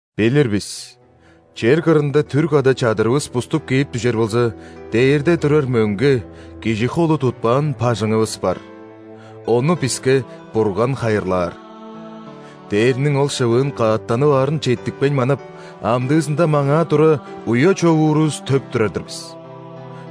Билир бис: чер кырында түр када чадырывыс буступ кээп дүжер болза, дээрде турар мөңге, кижи холу тутпаан бажыңывыс бар. Ону биске Бурган хайырлаар. Дээрниң ол шывыын каъттанып аарын четтикпейн манап, амдыызында маңаа тура, уё-човуурувус төп турар-дыр бис.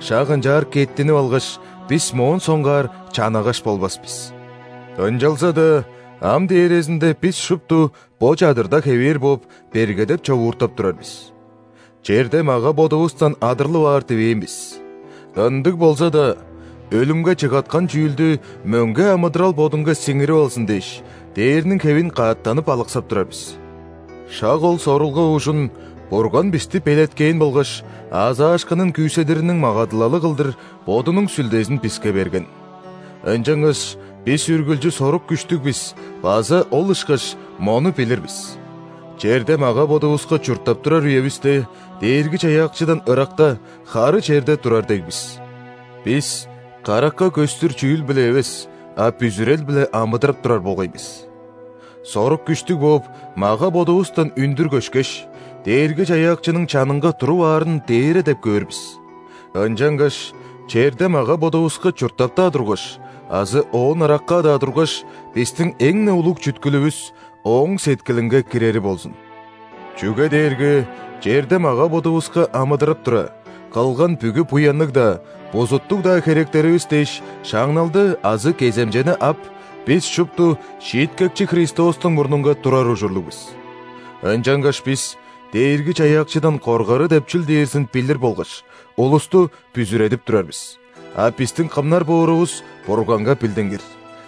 Шак ынчаар «кеттинип алгаш», бис моон соңгаар чанагаш болбас бис. Ынчалза-даа ам дээрезинде бис шупту бо чадырда хевээр бооп, бергедеп човууртап турар бис. Черде мага-бодувустан адырлып аар дивээн бис, ындыг болза-даа, өлүмге чыгаткан чүүлдү мөңге амыдырал бодунга сиңирип алзын дээш, дээрниң хевин каъттанып алыксап турар бис. Шак ол сорулга ужун Бурган бисти белеткээн болгаш аазаашкынын күүседириниң магадылалы кылдыр Бодунуң Сүлдезин биске берген. Ынчангаш бис үргүлчү сорук-күштүг бис база ол ышкаш мону билир бис: черде мага-бодувуска чурттап турар үевисте Дээрги-Чаяакчыдан ыракта, хары черде турар дег бис. (Бис каракка көстүр чүүл-биле эвес, а бүзүрел-биле амыдырап турар болгай бис.) Сорук-күштүг бооп, мага-бодувустан үндүр көшкеш, Дээрги-Чаяакчының чанынга туруп аарын дээре деп көөр бис. Ынчангаш черде мага-бодувуска чурттап-даа тургаш азы оон ыракка-даа тургаш, бистиң эң-не улуг чүткүлүвүс – Ооң сеткилинге кирери болзун. Чүге дээрге черде мага-бодувуска амыдырап тура, кылган бүгү буянныг-даа, бузуттуг-даа херектеривис дээш, шаңналды азы кеземчени ап, бис шупту Шииткекчи Христостуң мурнунга турар ужурлуг бис. Ынчангаш бис, Дээрги-Чаяакчыдан коргары деп чүл дээрзин билир болгаш, улусту бүзүредип турар бис, а бистиң кымнар боорувус Бурганга билдингир;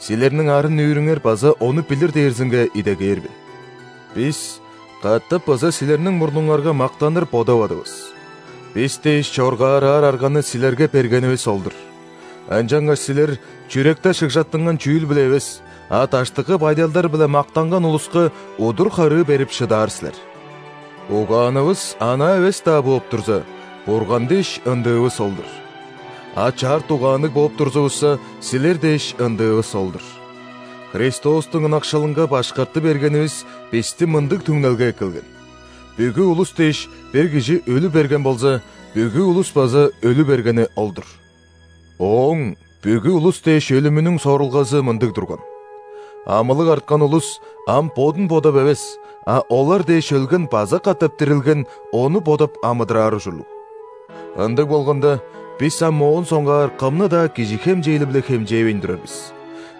силерниң арын-нүүрүңер база ону билир дээрзинге идегээр мен. Бис катап база силерниң мурнуңарга мактаныр бодавадывыс. Бис дээш чоргаараар арганы силерге бергенивис ол-дур. Ынчангаш силер чүректе шыгжаттынган чүүл-биле эвес, а даштыкы байдалдар-биле мактанган улуска удур харыы берип шыдаар силер. Угаанывыс анаа эвес-даа бооп турза, Бурган дээш, ындыывыс ол-дур. А чарт угаанныг бооп турзувусса, силер дээш, ындыывыс ол-дур. Христостуң ынакшылынга башкарты бергенивис бисти мындыг түңнелге эккелген: бүгү улус дээш, бир Кижи өлү берген болза, бүгү улус база өлү бергени ол-дур. Ооң бүгү улус дээш өлүмүнүң сорулгазы мындыг турган: амылыг арткан улус ам бодун бодап эвес, а олар дээш өлген база катап дирилген Ону бодап амыдыраар ужурлуг. Ындыг болганда, бис ам моон соңгаар кымны-даа кижи хемчээли-биле хемчээвейн турар бис.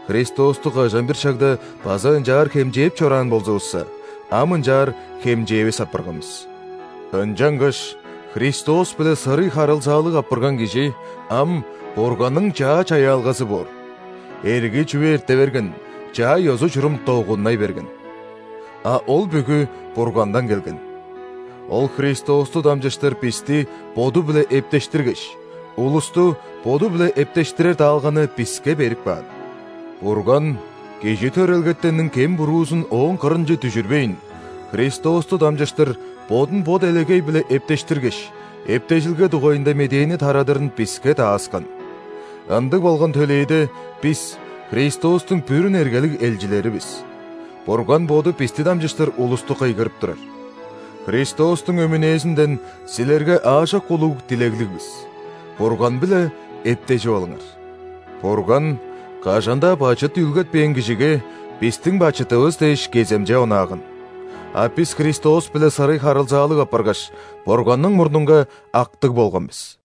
Христосту кажан-бир шагда база ынчаар хемчээп чораан болзувусса, ам ынчаар хемчээвес апарган бис. Ынчангаш Христос-биле сырый харылзаалыг апарган кижи ам Бурганның чаа чаяалгазы боор. Эрги чүве эрте берген – чаа ёзу-чурум догуннай берген. А ол бүгү Бургандан келген. Ол Христосту дамчыштыр бисти Боду-биле эптештиргеш, улусту Боду-биле эптештирер даалганы биске берип каан. Бурган кижи төрелгетенниң кем-буруузун ооң кырынче дүжүрбейн, Христосту дамчыштыр Бодун бо делегей-биле эптештиргеш, эптежилге дугайында медээни тарадырын биске дааскан. Ындыг болган төлээде, бис – Христостуң бүрүн эргелиг элчилери бис, Бурган Боду бисти дамчыштыр улусту кыйгырып турар. Христостуң өмүнээзинден силерге аажок улуг дилеглиг бис: Бурган-биле эптежип алыңар! Бурган кажан-даа бачыт үүлгетпээн Кижиге бистиң бачыдывыс дээш кеземче онааган, а бис Христос-биле сырый харылзаалыг апаргаш, Бурганның мурнунга актыг болган бис.